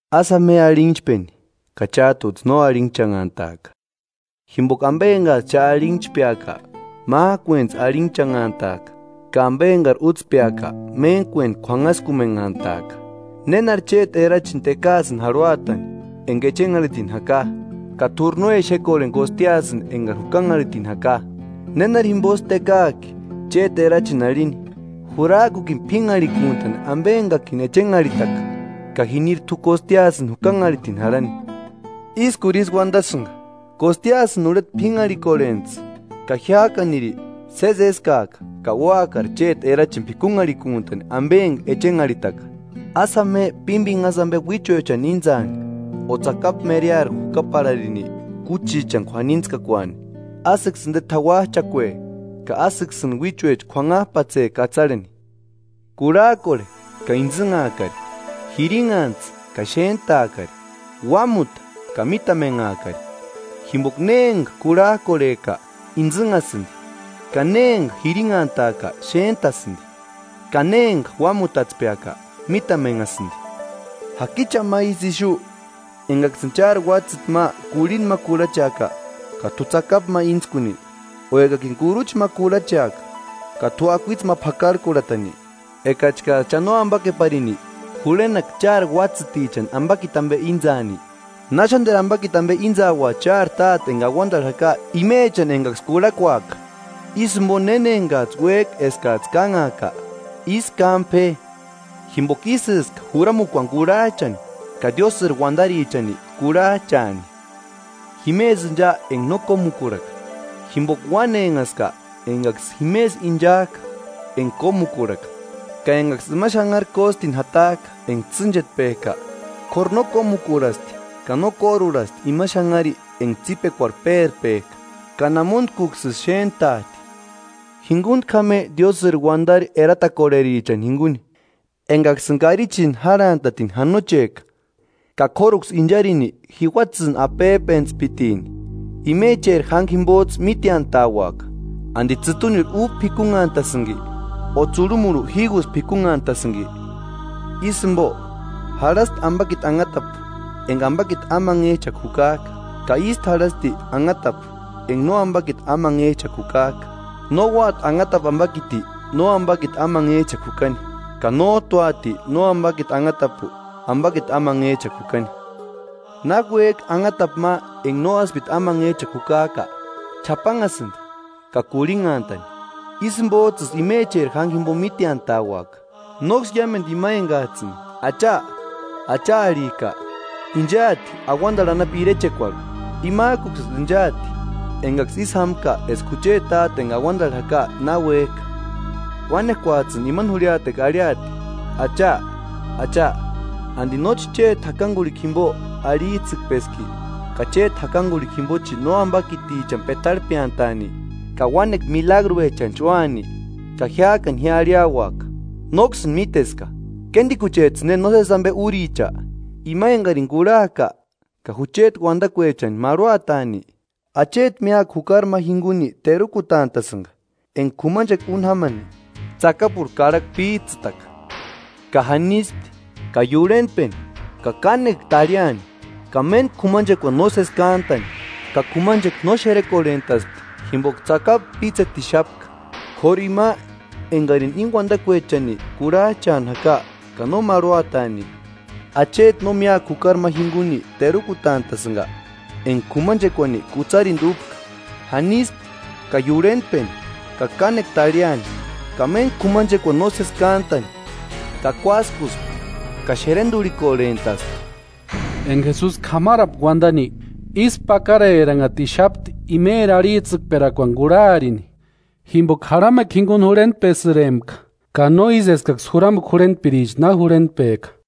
“Ásï jáma je arhinhchpeni ka chát'uts'ï no arhinhchanhantaaka, jimpoka ampe enkats'ï cha arhinhchpeaka, mák'uentsï arhinhchanhantaaka ka ampe enkari útspeaka méntkuenti k'uanhaskumenhantaaka. ¿Nénari chéti erachini tekaasïni jarhuatani enka echenharhitini jaka, ka t'úri no exekorheni kostiasïni enkari jukanharhitini jaka? ¿Nénari jimposï tekaak'i chéti erachini arhini? ‘Jurak'ukini p'ínharhikuntani ampe enkakini echenharhitaka’ ka jiniri t'u kostiasïni jukanharhitini jarhani. ¡Ískuri ísï uantasïnka! Kostiasïni urheta p'ínharhikorhentsï ka jiák'aniri sési éskaaka ka úakari chéti erachini p'ikunharhikuntani ampe enka echenharhitaka.” “Ásï jáma je pímpinhasï ampe uíchuechani íntsaani o tsakapu mereari jukaparharini kúchichani k'uanitskakuaani, ásïksï inte t'auach'akue ka ásïksïni uíchuecha k'uanhap'atse katsarheni.” “Kurhak'orhe ka intsïnhaakari, jirinhantsï ka xéntaakari, uámuta ka mítamenhaakari, jimpoka ne enka kurhak'orhek'a intsïnhasïnti, ka ne nema enka jirinhantak'a xéntasïnti ka ne nema enka uámutatspek'a mítamenhasïnti.” “¿Jaki cha ma ísï ixu, enkaksïni chári uátsïti ma kurhinta ma kurhacheaka ka t'u tsakapu ma íntskuni? ¿O ekakini kurucha ma kurhacheaka ka t'u akuitse ma p'akarhkurhatani? Ekachkats'ï cha nóampakeparini, jurhenaka chári uátsïtichani ampakiti ampe íntsaani, ¡Náxanteru ampakiti ampe íntsaua chári Táte enka auantarhu jaka imechani enkaksï kurhakuaka!” “Ísï jimpo néna enkats'ï uék'a eskats'ï kánhaaka, ísï kámpe je, jimpoka ísïska juramukuani kurhach'ani ka Diósïri uantarichani kurhach'aani.” “Jimesï incha enka no kómukurhaka, jimpoka uanhenhaska enkaksï jimesï inchak'a enka kómukuarhaka, ka enkaksï ima xanhari kóstini jatak'a enka tsînchetpek'a; k'óru no kómukurhasti ka no kórurhasti ima xanhari enka tsípekuarhu pérpek'a ka namuntkuksïsï xéntat'i.” “Jinkuntku jáma je diósïri uantari eratakorherichani jinkuni, enkaksïni karichini járhantatini janochek'a ka k'óruksï incharini jiuatsïni apep'entspitini. Imecheri jánkua jimpots'ï míteantaauaka. ¿Anti tsïtunirhu úba p'ikunhantasïnki o tsurhumurhu jígusï p'ikunhantasïnki? Ísï jimpo, jarhasti ampakiti anhatapu enka ampakiti amanhech'akua jukak'a, ka ístu jarhasti anhatapu enka no ampakiti amanhech'akua jukak'a. No úati anhatapu ampakiti no ampakiti amanhech'akua jukani, ka nót'u úati no ampakiti anhatapu ampakiti amanhech'akua jukani. Náki uék'i anhatapu ma enka no áspiti amanhech'akua jukak'a, ch'apanhasïnti ka kurhinhantani. Ísï jimpots'ïsï imecheri jánkua jimpo míteantauaka.” “Nóksï iámentu ima enkats'ïni ‘¡Acha, Acha arhik'a!’ Inchaati auantarhu anapu irechekuarhu, imak'uksïsï inchaati enkaksï ísï jámka eska jucheti Táte enka auantarhu jaka na uék'a. Uánekuats'ïni imani jurhiatekua arhiati: ‘Acha, Acha, ¿Anti nóchi chéti jakankurhikua jimpo arhits'ïkpeski, ka chéti jakankurhikua jimpochi nóampakitichani petarhpeantaani ka uánekua milagruechanchi úani?’ Ka jiák'ani ji arhiauaka: ‘Nóksïni míteska ¡Kéntikuchets'ïni nósesi ampe úricha!’” “Ima enkarini kurhak'a ka jucheti uantakuechani marhuataani, acheti míakua jukari ma jinkuni terukutant'a'sïnka enka k'umanchekua úni jámani tsakapurhu karhakua píts'ïtaka. Ka janispti, ka iurhentpeni ka kánekua tarhiani, ka méntku k'umanchekuani nósesi kántani, ka k'umanchekua no xerekorhent'aspti jimpoka tsakapu pítsetixapka. K'óru ima enkarini íni uantakuechani kurhach'ani jaka ka no marhuataani, acheti no míakua jukari ma jinkuni terukutant'a'sïnka enka k'umanchekuani kutsarintu úpka. Janispti ka iurhentpeni ka kánekua tarhiani, ka méntku k'umanchekuani nósesi kántani, ka kuáskuspti ka xerenturhikorhent'aspti.” Enka Jesusi k'amarapka uantani, ísku pakareranhatixapti imeri arhits'ïkperakuani kurharini, jimpoka jarhamekua jinkuni jurhentpesïrempka ka no ísï eskaksï juramukua jurhentpiricha na jurhentpek'a.